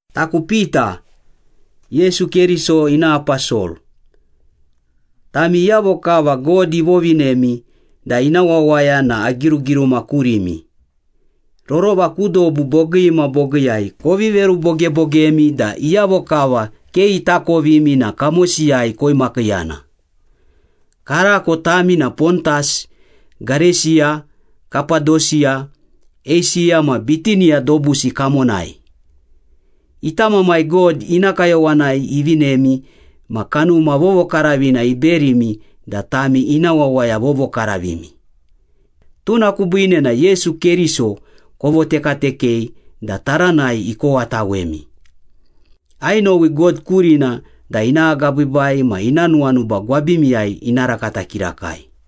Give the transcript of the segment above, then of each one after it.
Taku Pita, Yesu Keriso ina aposol. Tami iyavo kava God ivovinemi da ina wawaya na agirugiruma kurimi. Rorova ku dobu bogii ma bogiiyai kovi verubogebogemi da iyavo kava ke itakovimi na kamosiyai koimakiiyana. Karako tami na Pontas, Gareisiya, Kapadosiya, Eisiya ma Bitiniya dobusi kamonai. Ita Mamai God ina kayowanai ivinemi ma Kanuma Vovokaravina iberimi da tami ina wawaya vovokaravimi. Tuna kubiine na Yesu Keriso kovotekatekei da taranai ikowatawemi. Ainowi God kurina da ina agabiibai ma ina nuwanuba gwabimiyai ina rakata kirakai.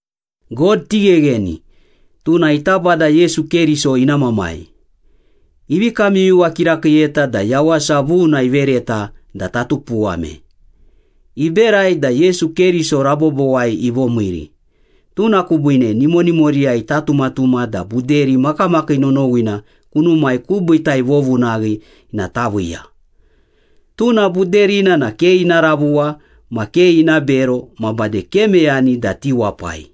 God tighegheni, tuna ita Bada Yesu Keriso ina Mamai. Ivi kamyuyuwa kirakiiyeta da yawasa vuna ivereta da tatupuwame. Iberai da Yesu Keriso rabobowai ivomiiri, tuna kubiine nimonimoriyai tatumatuma da buderi makamakii nonowina kunumai kubiita ivovunaghi na taviiya. Tuna buderina na ke ina ravuwa ma ke ina bero ma bade ke meyani da tiwapai.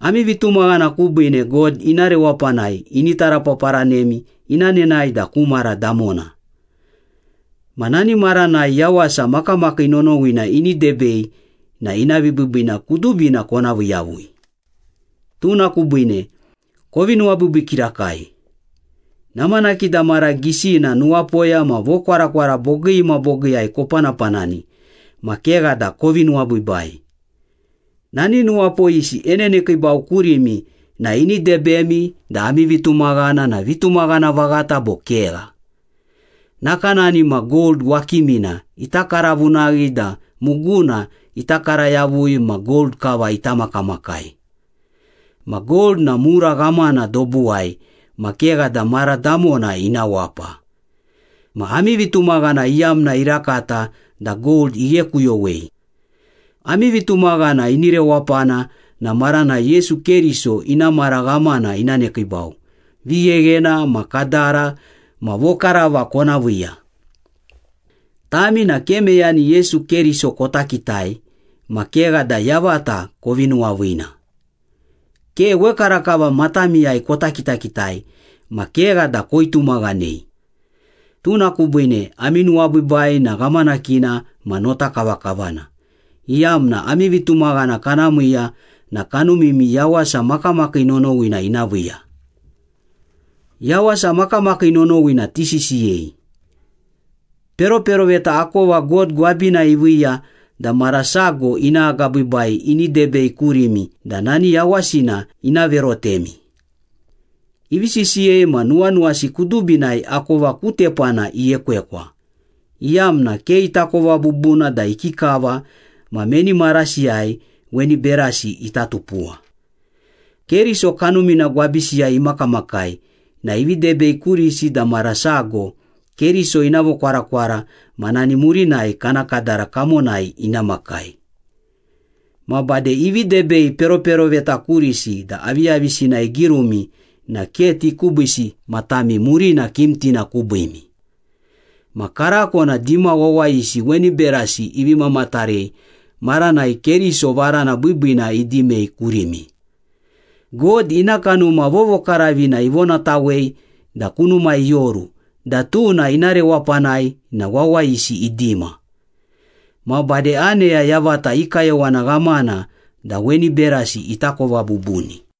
Ami vitumaghana kubiine God ina rewapanai ini tarapaparanemi ina nenae da ku mara damona. Ma nani maranai yawasa makamakii nonowina ini debei na ina vibiibiina kudubina kona vii yavui. Tuna kubiine kovi nuwabiibii kirakai! Namanaki da mara gisina nuwapoya ma vokwarakwara bogii ma bogiiyai kopanapanani ma kegha da kovi nuwabiibai. Nani nuwapoyisi enenekiibau kurimi na ini debemi da ami vitumaghana na vitumaghana vaghata bo kegha. Nakanani ma gold wakimina ita karavunaghi da muguna ita kara yavui ma gold kava ita makamakai. Ma gold na mura ghamana dobuwai ma kegha da mara damona ina wapa. Ma ami vitumaghana iyamna irakata da gold ighekuyowei. Ami vitumaghana ini rewapana na maranai Yesu Keriso ina mara ghamana ina nekiibau, vigheghena ma kadara ma vokarava kona viiya. Tami na ke meyani Yesu Keriso kota kitai ma kegha da yavata kovi nuwaviina. Ke wekarakava matamiyai kota kitakitai ma kegha da koitumaghanei. Tuna kubiine ami nuwabiibai na ghamanakina ma notakavakavana, iyamna ami vitumaghana kana miiya na kanumimi yawasa makamakii nonowina ina viiya. Yawasa makamakii nonowina tisisiyei. Peroperoveta akova God gwabinai iviiya da mara sago ina agabiibai ini debei kurimi da nani yawasina ina verotemi. Ivi sisiyei ma nuwanuwasi kudubinai akova ku tepana iekwekwa, iyamna ke itakova bubuna da ikikava ma meni marasiyai weni berasi ita tupuwa. Keriso Kanumina gwabisiyai imakamakai na ivi debei kurisi da mara sago Keriso ina vokwarakwara ma nani murinai kana kadara kamonai ina makai. Ma bade ivi debei peroperoveta kurisi da aviyavisina igirumi na ke ti kubiisi ma tami murina kimtina kubiimi. Ma karako na dima wawayisi weni berasi ivi mamatarei maranai Keriso varana biibiina idimei kurimi. God ina Kanuma Vovokaravina ivonatawei da kunumai ioru da tuna ina rewapanai na wawayisi idima. Ma bade aneya yavata i kayowana ghamana da weni berasi itakova bubuni.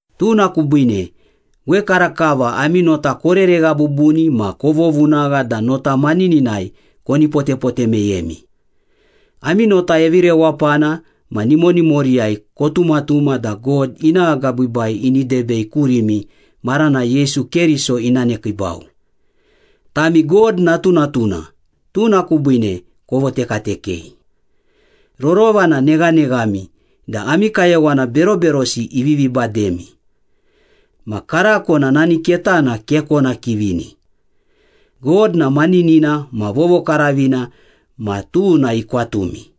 Tuna kubiine, wekarakava ami nota koreregha bubuni ma kovovunagha da nota manininai koni potepote meyemi. Ami nota evi rewapana ma nimonimoriyai kotumatuma da God ina agabiibai ini debei kurimi maranai Yesu Keriso ina nekiibau. Tami God natunatuna, tuna kubiine kovotekatekei. Rorova na neghaneghami da ami kayowana beroberosi ivivi bademi. Ma karako na nani ketana ke kona kivini. God na maninina ma vovokaravina ma tuna ikwatumi.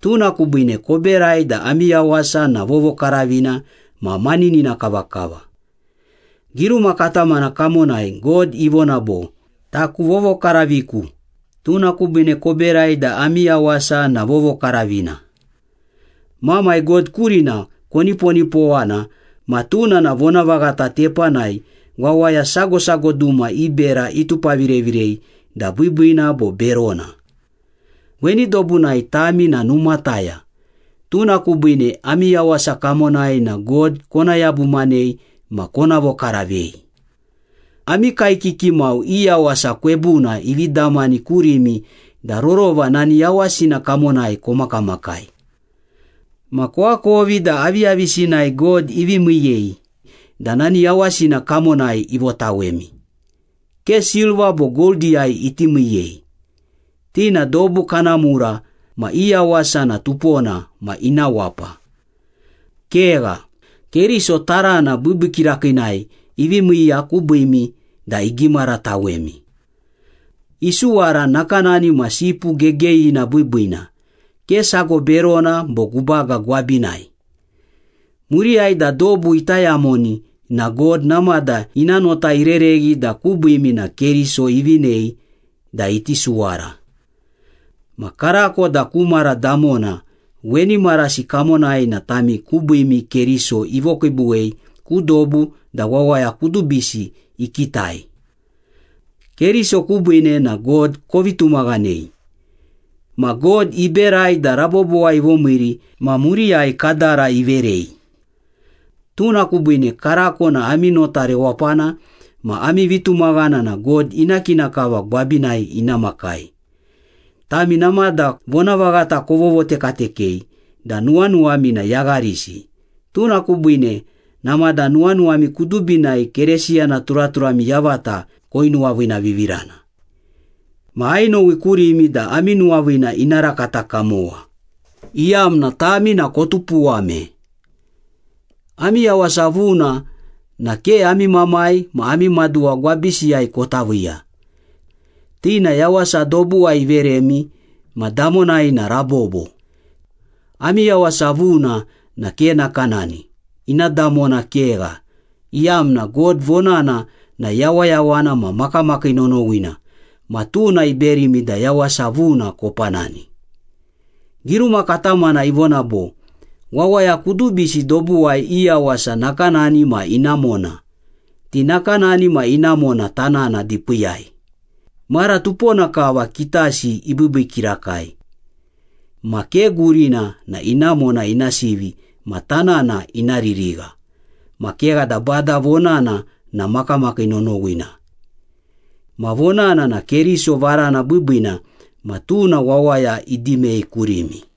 Tuna kubiine koberai da ami yawasa na vovokaravina ma maninina kavakava. Giruma katamana kamonai God ivona bo, “Taku vovokaraviku, tuna kubiine koberai da ami yawasa na vovokaravina.” Mamai God kurina koniponipowana ma tuna na vonavaghata tepanai wawaya sago sago duma i bera itupavirevirei da biibiina bo berona. Weni dobunai tami na numataya, tuna kubiine ami yawasa kamonai na God kona yabumanei ma kona vokaravei. Ami kaekiki mau i yawasa kwebuna ivi damani kurimi da rorova nani yawasina kamonai komakamakai. Ma koakovi da aviyavisinai God ivi miiyei da nani yawasina kamonai ivotawemi. Ke silva bo goldiyai iti miiyei. Ti na dobu kana mura ma i yawasa na tupona ma ina wapa. Kegha, Keriso tarana biibii kirakiinai ivi miiya kubiimi da igimaratawemi. Isuwara nakanani ma sipu gegeyina biibiina, ke sago berona bo gubaga gwabinai. Muriyai da dobu ita yamoni na God namada ina nota irereghi da kubiimi na Keriso ivinei da iti suwara. Ma karako da ku mara damona, weni marasi kamonai na tami kubiimi Keriso ivokiibuwei ku dobu da wawaya kudubisi ikitai. Keriso kubiine na God kovi tumaghanei. Ma God iberai da rabobowai ivomiiri ma muriyai kadara iverei. Tuna kubiine karako na ami nota rewapana ma ami vitumaghana na God ina kina kava gwabinai ina makai. Tami namada vonavaghata kovovotekatekei da nuwanuwami na yagharisi, tuna kubiine namada nuwanuwami kudubinai Keresiyana turaturami yavata koinuwaviinavivirana. Ma ainowi kurimi da ami nuwaviina ina rakata kamowa, iyamna tami na kotupuwame. Ami yawasa vuna na ke ami mamai ma ami maduwa gwabisiyai kota viiya. Ti na yawasa dobuwai iveremi ma damonai na rabobo. Ami yawasa vuna na ke nakanani, ina damona kegha, iyamna God vonana na yawayawana ma makamakii nonowina ma tuna iberimi da yawasa vuna kopanani. Giruma katamana ivona bo, “Wawaya kudubisi dobuwai i yawasa nakanani ma inamona, ti nakanani ma inamona tanana dipiiyai, mara tupona kava kitasi ibiibii kirakai. Ma ke gurina na inamona ina sivi ma tanana ina ririgha, ma kegha da Bada Vonana na makamakii nonowina.” Ma vonana na Keriso varana biibiina ma tuna wawaya idimei kurimi.